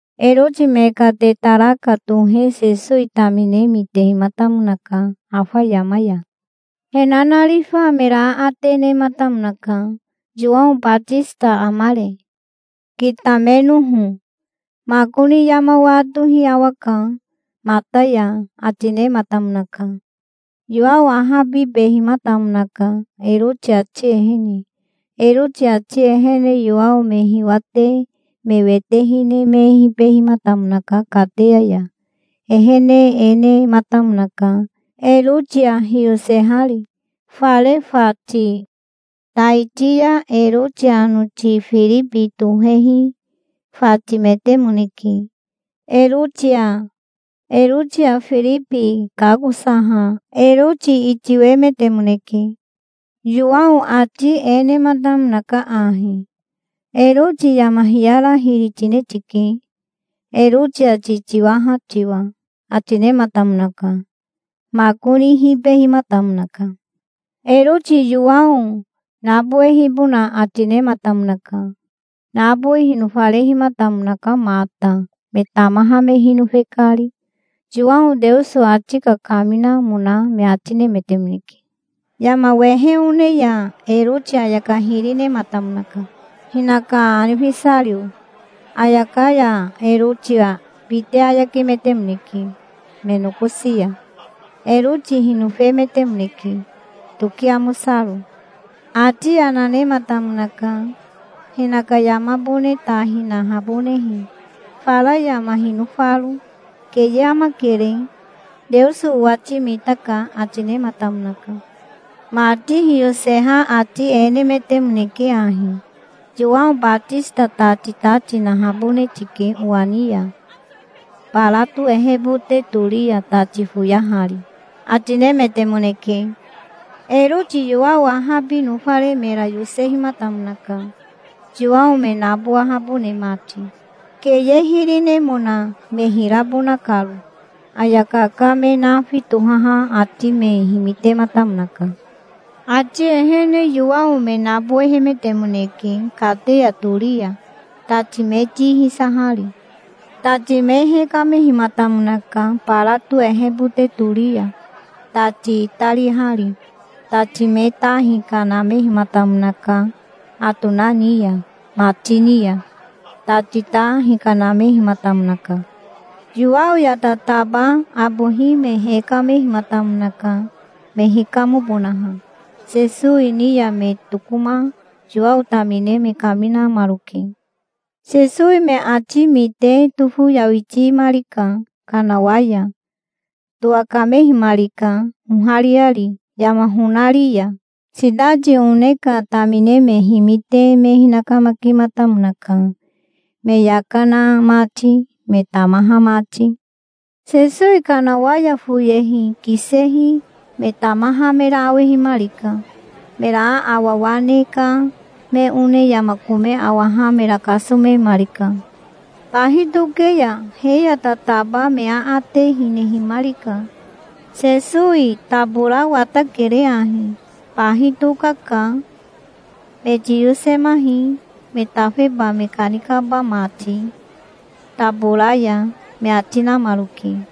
Eroti me ka tetaraka tohe Sesowi tamine mitehimatamonaka, afa yama ya. He nanarifa mera aate nematamonaka. "Yowao Batisita amare, kitamenoho? Makoni yama watohi awaka mata ya", ati nematamonaka. Yowao ahabibehimatamonaka Eroti ati ehene. Eroti ati ehene Yowao me hiwate me wete hine me hibehimatamonaka kateya ya. Ehene e nematamonaka Erotia hiyosehari, fare fati. Taiti ya Eroti anoti Firibi tohehi fatimetemoneke, Erotia. Erotia Firibi kakosaha Eroti itiwemetemoneke. Yowao ati e nematamonaka ahi. "Eroti yama hiyara hiri tine tike, Erotia titiwaha tiwa", ati nematamonaka. Makoni hibehimatamonaka. Eroti Yowao nabowehibona ati nematamonaka. Nabowi hinofarehimatamonaka mata, me tamaha me hinofe kari. Yowao Teoso ati kakaminamona me ati nemetemoneke. Yama wehe one ya Eroti ayaka hiri nematamonaka, hinaka anifesario. Ayaka ya Erotia bite ayakemetemoneke me nokosi ya. Eroti hinofemetemoneke, toki amosaro. Ati yana nematamonaka, hinaka yamabone ta hinahabonehe, fara yama hinofaro. "Keye amakere. Teoso owati mitaka", ati nematamonaka. Mati hiyoseha ati e nemetemoneke ahi: "Yowao Batisita tati ta tinahabone tike owa ni ya, barato ehebote tori ya tati foyahari", ati nemetemoneke. Eroti Yowao ahabi nofare mera yosehimatamonaka, Yowao me nabowahabone mati, keye hiri nemona me hirabona karo. Ayaka ka me nafi tohaha ati me himitematamonaka. Ati ehene Yowao me nabowehemetemoneke kateya tori ya, tati me ti hisahari. Tati me hekamehimatamonaka, barato ehebote tori ya tati itarihari. Tati me ta hikanamehimatamonaka atona ni ya. Mati ni ya tati ta hikanamehimatamonaka. Yowao ya tataba abohi me hekamehimatamonaka, me hikamobonaha. Sesowi ni ya me tokoma Yowao tamine me kaminamaroke. Sesowi me ati mite tofoyawitimarika kanawa ya. Towakamehimarika ohariari yama honari ya. Sitati one ka tamine me himite me hinakamakimatamonaka, me yaka na mati, me tamaha mati. Sesowi kanawa ya foyehi kisehi me tamaha mera awehimarika. Mera aawawa ne ka me one yama kome awaha mera kasomemarika. Bahi toke ya he ya tataba me aate hinehimarika. "Sesowi tabora watakere ahi. Bahi tokaka. Me tiyosemahi, me tafeba me kanikaba mati tabora ya", me ati namaroke.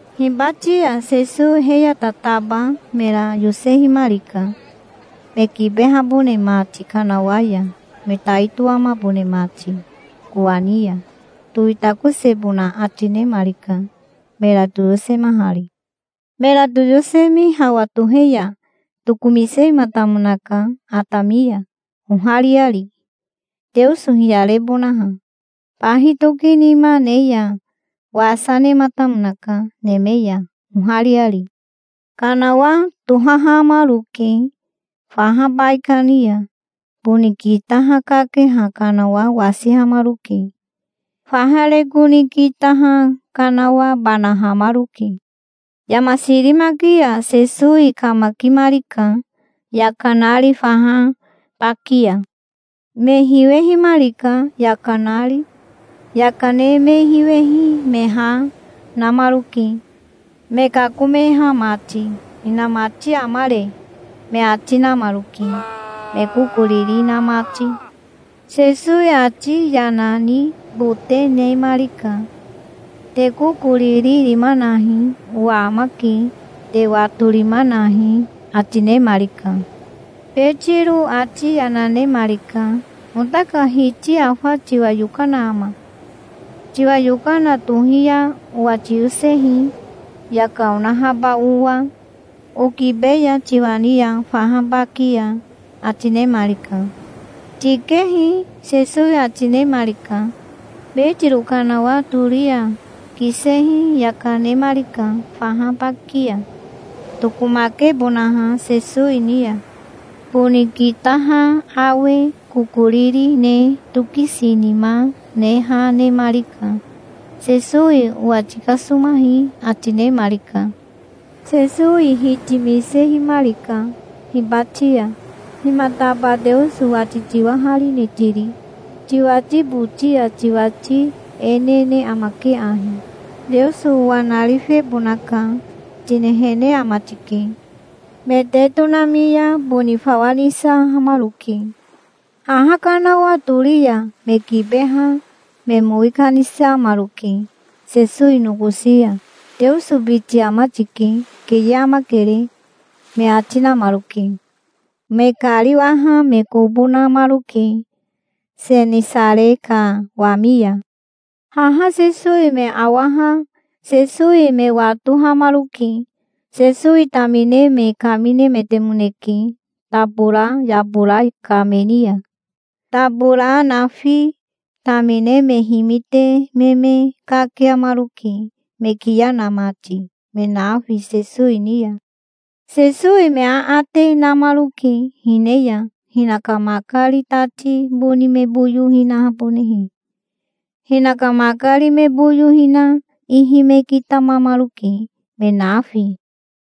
Hibati ya Sesowi he ya tataba mera yosehimarika, me kibehabone mati kanawa ya, me tai toamabone mati kowani ya. Towitakosebona ati nemarika, mera toyosemahari. Mera toyosemi hawa tohe ya tokomisehimatamonaka atami ya, ohariari, Teoso hiyarebonaha. Bahi tokinima ne ya wasa nematamonaka neme ya, ohariari. Kanawa tohahamaroke faha baikani ya. Boni kitaha kakeha kanawa wasihamaroke. Faha reko ni kitaha kanawa banahamaroke. Yama sirimaki ya Sesowi kamakimarika yaka nari faha baki ya. Me hiwehimarika yaka nari. Yaka ne me hiwehi me ha namaroke, me kakomeha mati. "Hinamati amare?" me ati namaroke, me kokoriri na mati. Sesowi ati yana nibote nemarika. "Te kokoriri rima nahi. Owa amake. Te watorima nahi", ati nemarika. Betiro ati yana nemarika. "Ota ka Hiti afa tiwa yokana ama? Tiwa yokana tohi ya owa tiyosehi, yaka onahaba owa, okibeya tiwa ni ya faha baki ya", ati nemarika. "Tikehi", Sesowi ati nemarika. Betiro kanawa tori ya kisehi yaka nemarika faha baki ya, tokomakebonaha Sesowi ni ya. Boni kitaha awe kokoriri ne tokisinima ne ha nemarika. "Sesowi owa tikasomahi", ati nemarika. Sesowi hitimisehimarika hibati ya. "Himataba Teoso wati tiwaharine tiri? Tiwati boti ya tiwati e nene amake ahi: 'Teoso owa narifebonaka', tinehene ama tike". Me te tonami ya boni fawa nisahamaroke. Haha kanawa tori ya me kibeha me mowi kanisamaroke Sesowi nokosi ya. "Teoso biti ama tike. Keye amakere", me ati namaroke. Me kariwaha me kobo namaroke Senisare ka wami ya. Haha Sesowi me awaha Sesowi me watohamaroke. Sesowi tamine me kaminemetemoneke tabora yabora ka me ni ya, tabora nafi. Tamine me himite me me kakiamaroke, me kiya na mati, me nafi, Sesowi ni ya. Sesowi me aate namaroke, hine ya hinaka makari tati boni me boyo hinahabonehe. Hinaka makari me boyo hina ihi me kitamamaroke, me nafi.